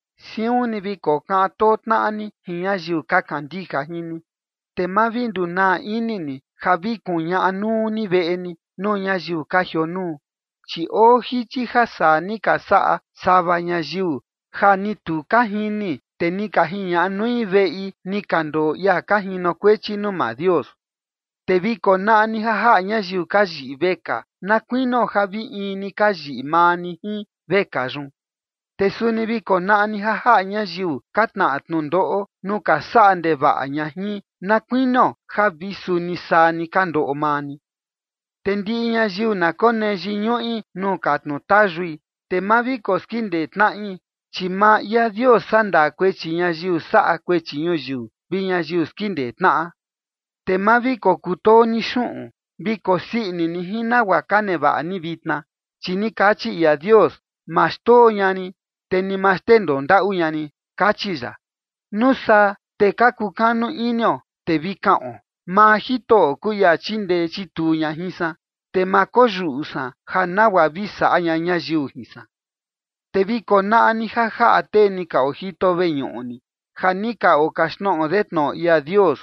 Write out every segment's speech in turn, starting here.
Siun ni vi kokaꞌan too tnaꞌa ni jin ñayiu ka kandija jin ni. Te ma vi ndunaa ini ni ja vi kuñaꞌa nuu ni veꞌe ni, nuu ñayiu ka jionuu. Chi oo jichi ja saa ni ka saꞌa sava ñayiu, ja ni tu ka jini, te ni ka jiñaꞌa nui veꞌi ni ka ndoo ia ka jinokuechi nuu maa Dios. Te vi konaꞌa ni ja jaꞌa ñayiu ka yiꞌi vekaa, na kuinio ja vi in ni ka yiꞌi maa ni jin vekaa yun. Te suni vi konaꞌa ni ja jaꞌa ñayiu ka tnaꞌa tnundoꞌo nuu ka saꞌa ndevaꞌa ña jin, na kuinio ja vi suni saa ni ka ndoꞌo maa ni. Te ndiꞌi ñayiu na konee yiñuꞌi nuu katnu tayui, te ma vi koskindee tnaꞌi, chi maa ia Dios sandaa kuechi ñayiu saꞌa kuechi ñuyiu vi ñayiu skindee tnaꞌa. Te ma vi kokutoo ni xuꞌun. Vi kosii ini ni jin nagua ka nevaꞌa ni vitna, chi ni kachi ia Dios: “Ma xndoo ña rin, te ni ma xndendoo ndaꞌu ña rin”, kachi ya. Nuu saa te ka kukanu inio, te vi kaꞌon: Maa Jitoꞌo kuu ia chindee chituu ña jin san, te ma koyuꞌu san ja nagua vi saꞌa ña ñayiu jin san. Te vi konaꞌa ni ja jaꞌa tee ni ka ojito veñuꞌu ni, ja ni ka okaxtnoꞌo de tnoꞌo ia Dios,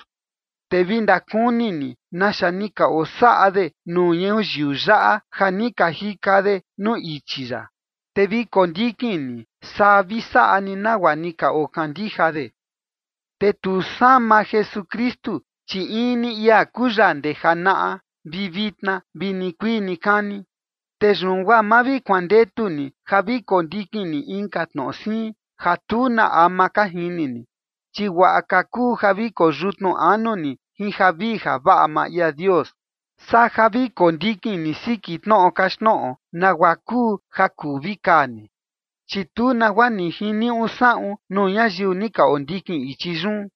te vi ndakuni ni naxa ni ka osaꞌa de nuu ñuyiu yaꞌa ja ni ka jika de nuu ichi ya, te vi kondikin ni, saa vi saꞌa ni nagua ni ka okandija de. Te tu sama Jesukristu, chi in ni ia kuu ya ndee janaꞌa, vi vitna, vi nikuii nikani. Te yun guaa ma vi kuandetu ni ja vi kondikin ni inka tnoꞌo siin, ja tu na ama ka jini ni, chi guaꞌa ka kuu ja vi koyutnu anu ni jin javii javaꞌa maa ia Dios, saa ja vi kondikin ni siki tnoꞌo kaxtnoꞌo nagua kuu ja kuu vi kaa ni, chi tu nagua ni jiniuꞌu saꞌun nuu ñayiu ni ka ondikin ichi yun.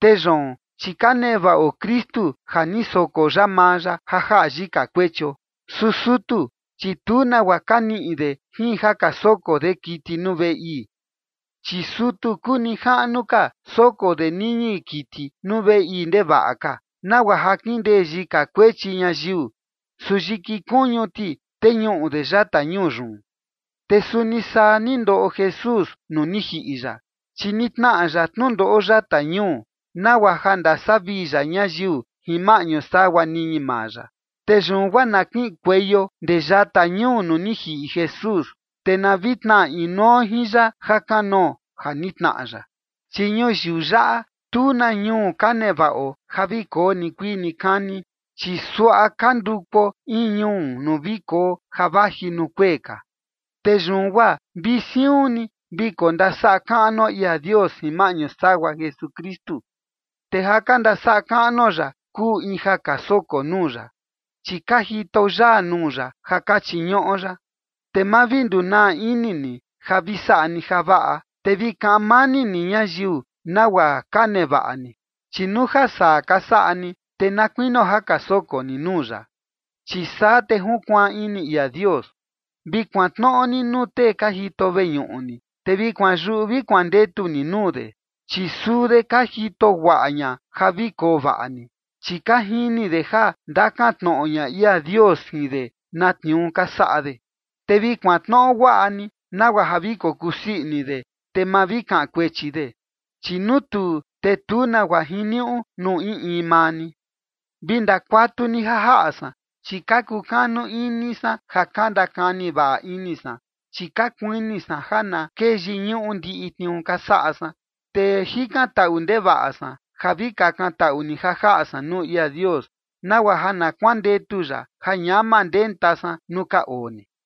Te yoon, chi ka nevaꞌo Kristu ja ni soko ya maa ya ja jaꞌa yika kuechio. Su sutu, chi tu nagua ka niꞌi de jin ja ka soko de kiti nuu veꞌe ii. Chi sutu kuu nijaꞌnu ka, soko de niñi kiti nuu veꞌe ii ndevaꞌa ka, nagua ja kindee yika kuechi ñayiu, su yiki kuñu ti teñuꞌu de yata ñuu yun. Te suni saa ni ndoꞌo Jesús nuu ni jiꞌi ya, chi ni tnaꞌa ya tnundoꞌo yata ñuu, nagua ja ndasavii ya ñayiu jin maꞌñu sagua niñi maa ya. Te yun guaa na kiꞌinkueio ndee yata ñuu nuu ni jiꞌi Jesús, te na vi tnaꞌa inuo jin ya jakanoo ja ni tnaꞌa ya. Chi ñuyiu yaꞌa, tu na ñuu ka nevaꞌo ja vi koo nikuii nikani, chi suaꞌa ka ndukuo in ñuu nuu vi koo ja vaji nuu kuee ka. Te yun guaa vi siun ni vi kondasaꞌa kaꞌnuo ia Dios jin maꞌñu sagua Jesukristu, te ja ka ndasaꞌa kaꞌnuo ya kuu in ja ka soko nuu ya, chi ka jitao yaa nuu ya ja ka chiñuꞌo ya. Te ma vi ndunaa ini ni ja vi saꞌa ni javaꞌa, te vi kaꞌan mani ni ñayiu nagua ka nevaꞌa ni. Chi nuu ja saa ka saꞌa ni, te na kuinio ja ka soko ni nuu ya, chi saa te junkuaan ini ia Dios. Vi kuantnoꞌo ni nuu tee ka jito veñuꞌu ni, te vi kuanyuꞌu vi kuandetu ni nuu de, chi suu de ka jito guaꞌa ña ja vi koo vaꞌa ni, chi ka jini de ja ndakan tnoꞌo ña ia Dios jin de na tniuu ka saꞌa de. Te vi kuantnoꞌo guaꞌa ni, nagua ja vi kokusii ini de, te ma vi kaꞌan kuechi de, chi nuu tuu, te tu nagua jiniuꞌu nuu in in maa ni. Vi ndakuatu ni ja jaꞌa san, chi ka kukanu ini san ja ka ndakani vaꞌa ini san, chi ka kuini san ja na kee yiñuꞌu ndiꞌi tniuu ka saꞌa san. Te jikantaꞌu ndevaꞌa san ja vi kakantaꞌu ni ja jaꞌa san nuu ia Dios, nagua ja na kuandetu ya ja ñama ndenta san nuu ka oo ni.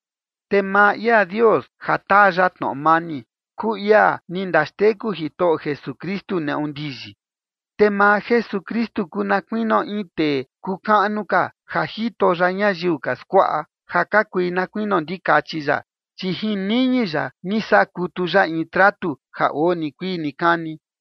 Te maa ia Dios ja taa ya tnoꞌo mani, kuu ia ni ndaxteku Jitoꞌo Jesukristu neꞌu ndiyi. Te maa Jesukristu kuu na kuinio in tee kuu kaꞌnu ka, ja jito ya ñayiu ka skuaꞌa, ja ka kui na kuinio ndikachi ya, chi jin niñi ya ni saꞌa kutu ya in tratu ja oo nikuii nikani.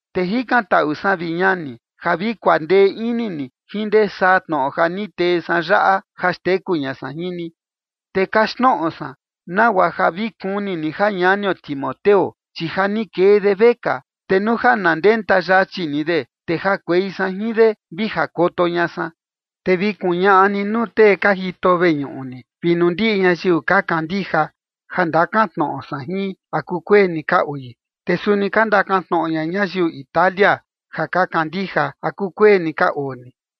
Te jikantaꞌu san, vi ñani, ja vi kuandee ini ni jin ndee saa tnoꞌo ja ni tee san yaꞌa ja xteku ña san jin ni. Te kaxtnoꞌo san nagua ja vi kuni ni ja ñanio Timoteo, chi ja ni kee de vekaa, te nuu ja na ndenta yachi ni de, te jakuei san jin de, vi jakoto ña san. Te vi kuñaꞌa ni nuu tee ka jito veñuꞌu ni, vi nuu ndiꞌi ñayiu ka kandija, ja ndakan tnoꞌo san jin, ¿a kukueni ka oi. Te suni ka ndakan tnoꞌo ña ñayiu Italia ja ka kandija, ¿a kukueni ka oo ni?